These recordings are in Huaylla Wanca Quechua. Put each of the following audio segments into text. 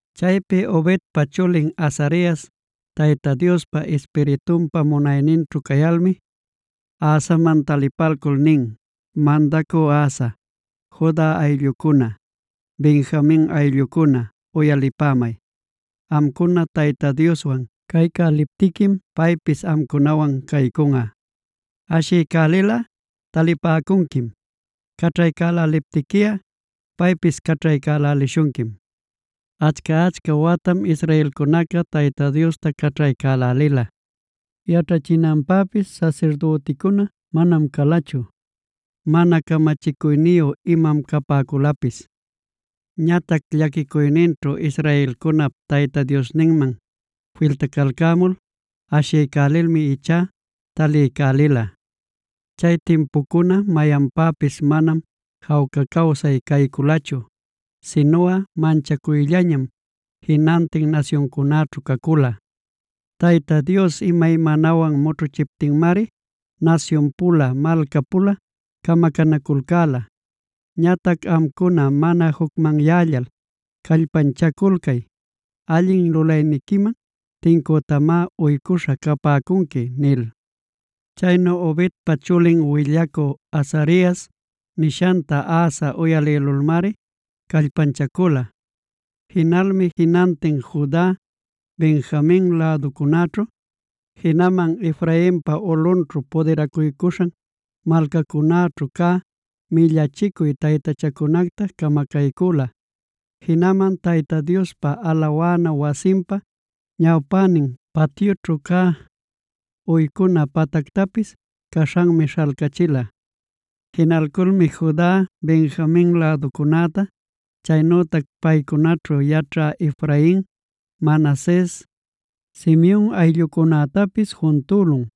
Chaypi Obedpa chulin Azarias Tayta Diospa Ispiritunpa munayninćhu cayalmi, Asaman talipalcul nin: “Mandacü Asa, Juda ayllucuna, Benjamin ayllucuna uyalipämay. Amcuna Tayta Dioswan caycäliptiquim paypis amcunawan caycunꞌa. Ashiycälilꞌa talipäcunquim. Caćhaycäläliptiquiꞌa paypis caćhaycälälishunquim. Achca-achca watam israelcunaca Tayta Diosta caćhaycälälila. Yaćhachinanpäpis sasirdüticuna manam calachu; mana camachicuyniyu imam capäculapis. Ñatac llaquicuyninćhu israelcunap Tayta Diosninman filtacalcämul ashiycälilmi ichá taliycälila. Chay timpucuna mayanpäpis manam jawca cawsay cayculachu, sinuꞌa manchacuyllañam jinantin nasyuncunäćhu cacula. Tayta Dios imaymanawan mućhuchiptinmari nasyun-pula, malca-pula camacanaculcäla. Ñatac amcuna mana jucmanyällal callpanchaculcay; allin lulayniquiman tincütamá uycuśha capäcunqui” nil. Chaynu Obedpa chulin willacü Azarias nishanta Asa uyalïlulmari callpanchacula. Jinalmi jinantin Juda, Benjamin läducunäćhu, jinaman Efrainpa ulꞌunćhu pudiracuycuśhan malcacunäćhu cä millachicuy taytachacunacta camacaycüla. Jinaman Tayta Diospa alawana wasinpa ñawpänin patyućhu cä, uycuna patactapis caśhanmi śhalcachila. Jinalculmi Juda, Benjamin läducunäta, chaynütac paycunaćhu yaćhä Efrain, Manases, Simeon ayllucunätapis juntülun.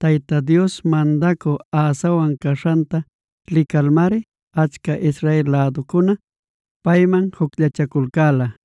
Tayta Dios mandacü Asawan caśhanta licalmari achca Israel läducuna payman jucllachaculcäla.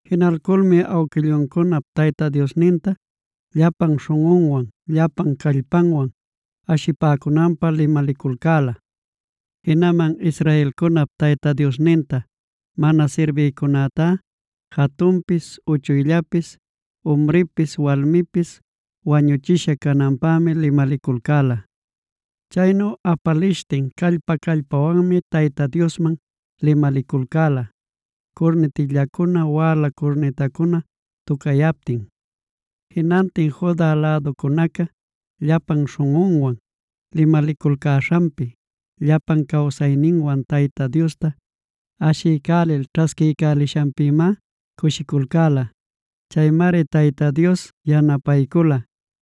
Jinalculmi awquilluncunap Tayta Diosninta llapan śhunꞌunwan, llapan callpanwan ashipäcunanpä limaliculcäla. Jinaman israelcunap Tayta Diosninta mana sirbïcunätá jatunpis uchuyllapis, umripis walmipis wañuchisha cananpämi limaliculcäla. Chaynu apalishtin callpa-callpawanmi Tayta Diosman limaliculcäla, curnitillacuna wäla curnitacuna tucayaptin. Jinantin Juda läducunaca llapan śhunꞌunwan limaliculcäśhanpi, llapan cawsayninwan Tayta Diosta ashiycälil ćhasquiycälishanpïmá cushiculcäla. Chaymari Tayta Dios yanapaycula,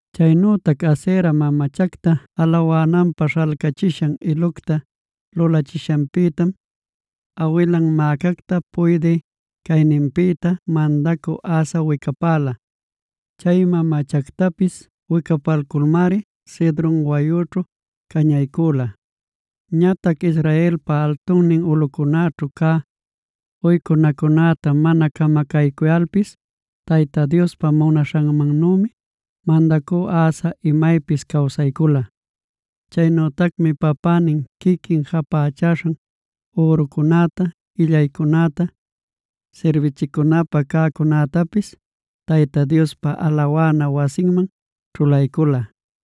Chaynütac Asera mamachacta alawananpä śhalcachisha ilucta lulachishanpïtam, awilan Maacacta puydï cayninpïta, mandacü Asa wicapäla. Chay mamachactapis wicapalculmari Cedron wayućhu cañaycüla. Ñatac Israelpa altunnin ulꞌucunäćhu cä uycunacunäta mana camacaycuyalpis, Tayta Diospa munaśhanmannümi mandacü Asa imaypis cawsaycula. Chaynütacmi papänin, quiquin japächaśhan ürucunäta, illaycunäta, sirbichicunapä cäcunätapis Tayta Diospa alawana wasinman ćhulaycula.